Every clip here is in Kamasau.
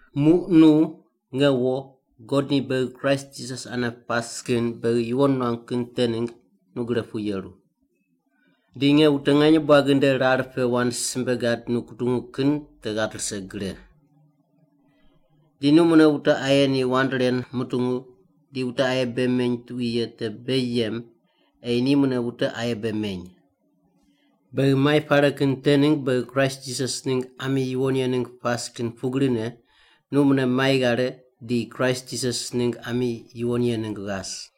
Muq nu, nge wo, God ni beghi Kraist Jisas ane pas kin beghi yuwon nuangu kin te ningg nu gre pu yeru. Di nge wute nganye buagi nde rar pe wand simbe gad nu kutungu kin te ghat rise gre. Di nu mune wute aye ni wand ren mutungu di wute aye bei meny tuqui ye te bei yem ei ni mune wute aye bei meny. Beghi mai pare kin te ningg beghi Kraist Jisas ningg ami yuwon ye ningg pas kin pugrine nu mune mai ghare di Kraist Jisas ningg ami yuwon ye ningg ghas.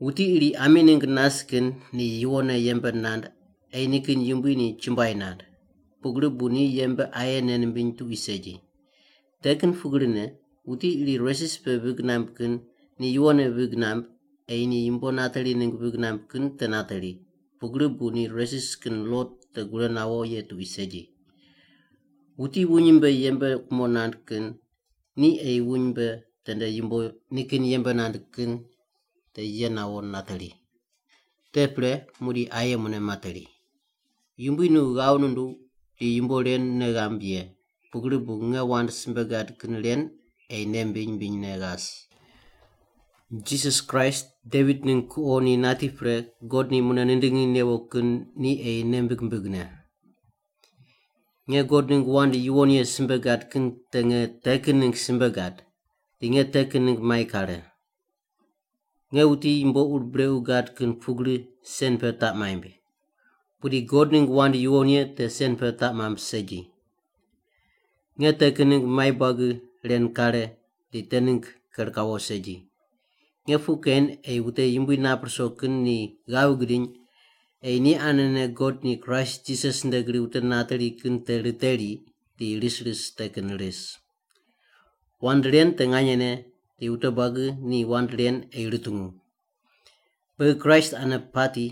Wuti iri ami ningg nas kin ni yuwonne yembe nand ei nikin yumbui ni chumbuai nand, pugri bu ni yembe aye nei nimbiny tuqui segi. Te kin pugrine wuti iri resis pe vig namb kin ni yuwonne vig namb ei ni yumbo nateri ningg vig namb kin te nateri, pugri bu ni resis kin lo te gure nawo ye tuqui segi. Wuti wuny mbe yembe kumo nand kin ni ei wuny mbe tende yumbo nikin yembe nand kin te ye nawo nateri. Te pre muqdi aye mune materi. Yumbui nu ghav nunduw di yumbo ren nei ghamb ye, pugri bu nge wand simbe gad kin ren ei nei mbiny mbinyne ghas. Jisas Kraist, Devit ningg kuqo ni nati pre God ni mune nindingi newo kin ni ei nei mbig mbigne. Nge God ningg wand yuwon ye simbe gad kin te nge te kin ningg simbe gad, di nge te kin ningg mai kare. Nge wuti yumbo ur brequ gad kin pugri sen pe taq maimb. Pudi God ningg wand yuwon ye te sen pe taq mamb segi. Nge te kin ningg mai buagi ren kare di te ningg ker kawo segi. Nge puq ken ei wute Yumbui nap ruso kin ni ghav gidiny ei ni anene God ni Kraist Jisas nde gri wute nateri kin te riteri di ni ris ris te kin ris. Wand ren te nganyene di wute buagi ni wand ren ei rutungu: Beghi Kraist ane pati,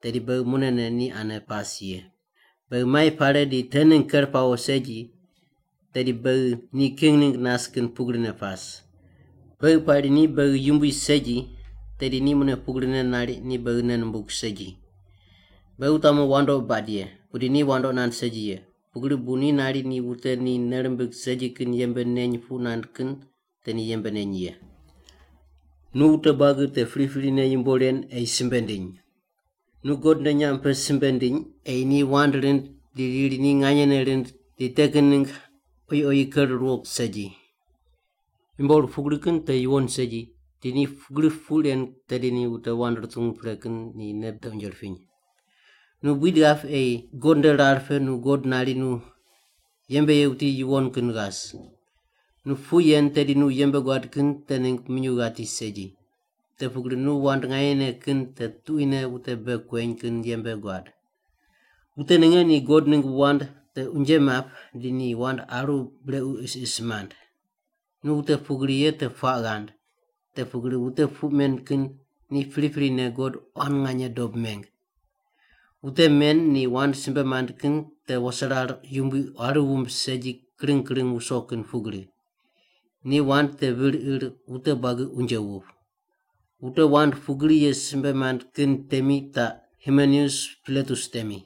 tedi beghi munene ni ane pas ye. Beghi mai pare di te ningg ker pawo segi, tedi beghi ni king ningg nas kin pugrine pas. Beghi pari ni beghi Yumbui segi, tedi ni mune pugrine nari ni beghi nei numbug segi. Beghi wutamu wandoqi bad ye, pudi ni wandoqi nand segi ye, pugri bu ni nari ni wute ni nei rimbig segi kin yembe neny puq nand kin te ni yembe neny ye. Nu wute buagi te priprine yumbo ren ei simbe ndiny. Nu God nde nyamb pe simbe ndiny ei ni wand rind di riri ni nganyene rind di te kin ningg oyi oyi ker ruwo segi. Yumbo ur pugri kin te yuwon segi, di ni pugri puq ren tedi ni wute wand rutungu pre kin ni nei te unje ripiny. Nu buid ghap ei God nde rar pe nu God nari nu yembe ye wuti yuwon kin ghas. Nu puq yen tedi nu yembe guad kin te ningg minyuw ghati segi, te pugri nu wand nganyene kin te tuquine wute bei kueny kin yembe guad. Wute ninge ni God ningg wand te unje map di ni wand aru brequ isis mand. Nu wute pugri ye te puaq ghand, te pugri wute puq men kin ni priprine God quan nganye dob meng. Wute men ni wand simbe mand kin te waserar yumbui quari wumb segi kring kring wuso kin pugri, ni wand te vir ir wute buagi unje wup. Wute wand pugri ye simbe mand kin temi taq Himeneus Piletus temi.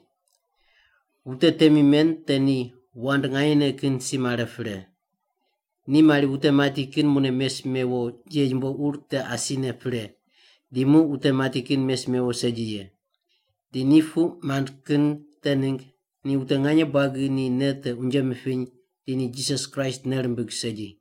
Wute temi men te ni wand nganyene kin si mare pre. Ni mari wute mati kin mune mes mewo ye yumbo ur te asine pre, di muq wute mati kin mes mewo segi ye. Di ni puq mand kin te ningg ni wute nganye buagi ni nei te unje mipiny di ni Jisas Kraist nei rimbig segi.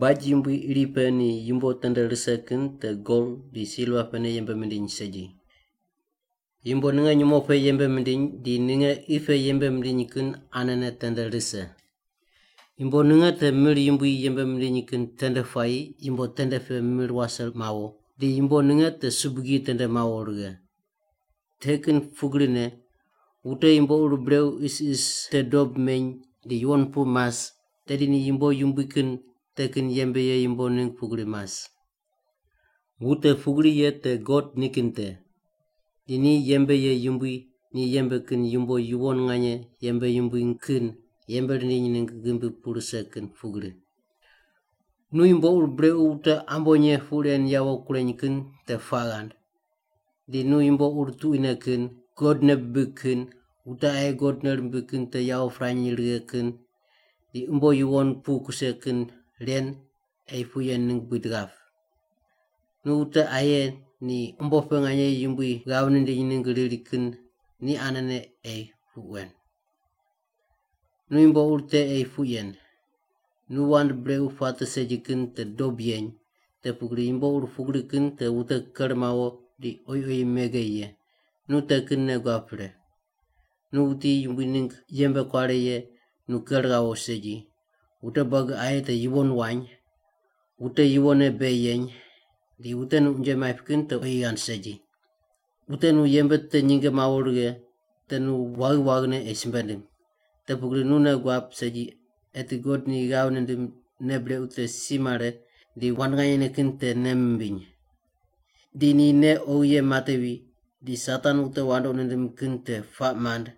Baj yumbui iri pe ni yumbo tende rise kin te gol di silva pene yembe mindiny segi. Yumbo ninge nyumo pe yembe mindiny di ninge qi pe yembe mindiny kin anene tende rise. Yumbo ninge te mir yumbui yembe mindiny kin tende puayi yumbo tende pe mir wase mawo, di yumbo ninge te subugi tende mawo righe. Te kin pugrine wute yumbo ur brequ isis te dob meny di yuwon pu mas, tedi ni yumbo yumbui kin te kin yembe ye yumbo ningg pugri mas. Wute pugri ye te God nikin te, di ni yembe ye yumbui ni yembe kin yumbo yuwon nganye yembe yumbui kin yembe rindiny ningg ghimbi pu rise kin pugri. Nu yumbo ur brequ wute ambonye puq ren yawo kureny kin te puaq ghand, di nu yumbo ur tuquine kin, God nei bibig kin, wute aye God nei rimbig kin te yawo pirany righe kin, di umbo yuwon pu kuse kin ren ei puq yen ningg buid ghap. Nu wute aye ni umbo pe nganye Yumbui ghav nindiny ningg riri kin ni anene ei puq wen. Nu yumbo ur te ei puq yen. Nu wand brequ puate segi kin te dob yeny, te pugri yumbo ur pugri kin te wute ker mawo di oyi oyi mege ye, nu te kin nei guab pre. Nu wuti Yumbui ningg yembe kuare ye nu ker ghawo segi, wute buagi aye te yuwon wany, wute yuwonne bei yeny, di wute nu unje maip kin te oyi ghand segi. Wute nu yembe te nyinge mawo righe, te nu waghi waghine ei simbe ndim. Te pugri nu nei guab segi eti God ni ghav nindim nei brequ te si mare di wand nganyene kin te nei mimbiny. Di ni nei oghi ye matevi di Satan wute wandoqi nindim kin te puaq mand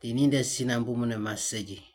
di ninde si nambu mune mas segi.